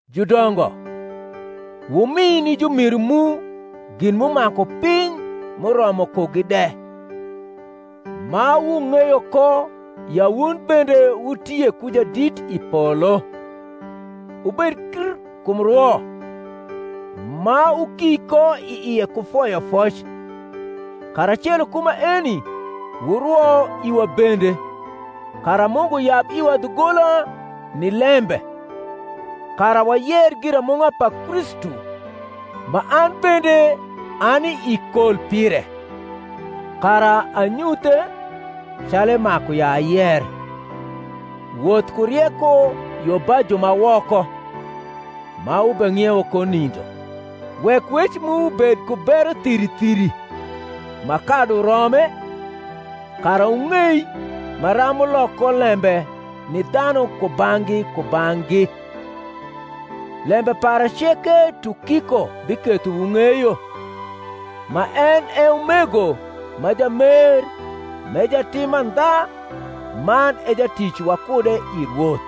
Judongo, wumi ni jumiru mu gin m’umaku piny m’uromo kugi de; ma wung’eyo ko ya wun bende wutie ku Jadit i polo. Wubed kr kum rwo, ma wuki ko i ie ku foyofoc; karacelo ku maeni wurwo iwa bende, kara Mungu yab iwa dhugola ni lembe, kara wayer giramung’a pa Kristu, ma an bende ani i kol pire; kara anyuthe, calu emaku ya Woth ku rieko yo ba ju woko, ma wubeng’iewo ko nindo. Wek wec mu bed ku bero thiri thiri, ma kadu rome, kara wung’ei maram wulok ko lembe ni dhanu kubang’gi kubang’gi. Lembe para ceke Tukiko biketho wung’eyo, ma en e umego ma jamer m’e jatim mandha man e jatic wakude i Rwoth: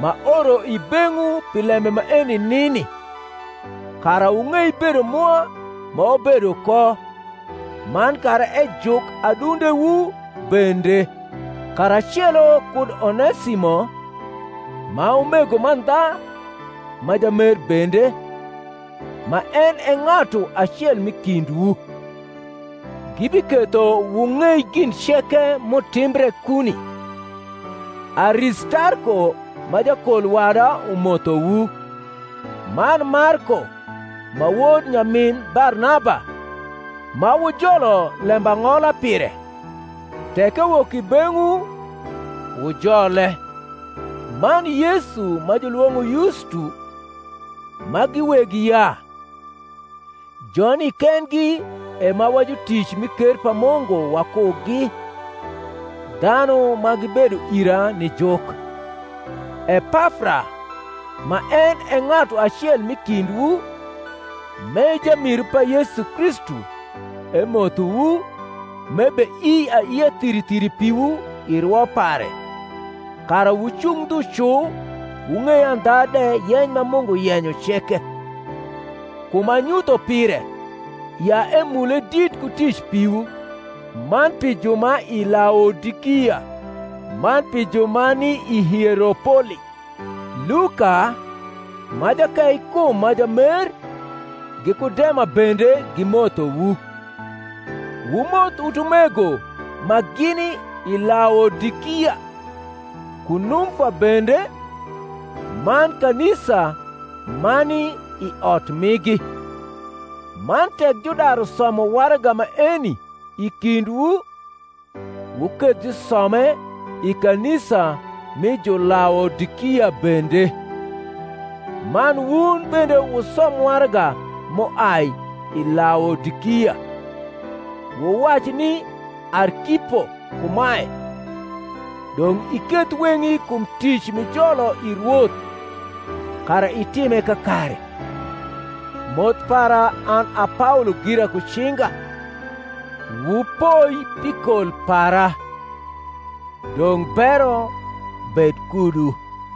m’aoro i beng’wu pi lembe maeni nini, kara wung’ei bedo mwa ma wabedo ko, man kara ejuk adundewu bende; karacelo kud Onesimo, ma umego mandha ma jamer bende, ma en e ng’atu acel m’i kindwu. Gibiketho wung’ei gin ceke m’utimbre kuni. Aristarko ma jakol wada umothowu, man Marko, ma wod nyamin Barnaba (ma wujolo lembang’ola pire; tek ewok i beng’wu, wujole), man Yesu ma jniwong’o Yustu, ma gi weg yaa: joni kendgi e ma wa jutic mi ker pa Mungu wakugi, dhanu ma gibedo ira ni juk. Epafra, ma en e ng’atu acel m’i kindwu, m’e jamiru pa Yesu Kristu, emothowu, m’ebeii aiia thiri thiri piwu i rwo pare, kara wucung ndhu cu wung’ei andha de yeny ma Mungu yenyo ceke. Kum anyutho pire, ya emule dit ku tic piwu, man pi ju ma i Laodikia, man pi ju ma ni i Hieropoli. Luka, ma jakeikum ma jamer, giku Dema bende gimothowu. Wumoth utumego ma gini i Laodikia, ku Numfa bende, man kanisa ma ni i ot migi. Man tek judaru somo waraga maeni i kindwu, wuketh jusome i kanisa mi Julaodikia bende; man wun bende wusom waraga m’uai i Laodikia. Wuwac ni Arkipo kumae, Dong’ iketh weng’i kum tic m’ijolo i Rwoth, kara itime kakare. Moth para an a Paolo gira ku cinga. Wupoi pi kol para. Dong’ bero bed kudu.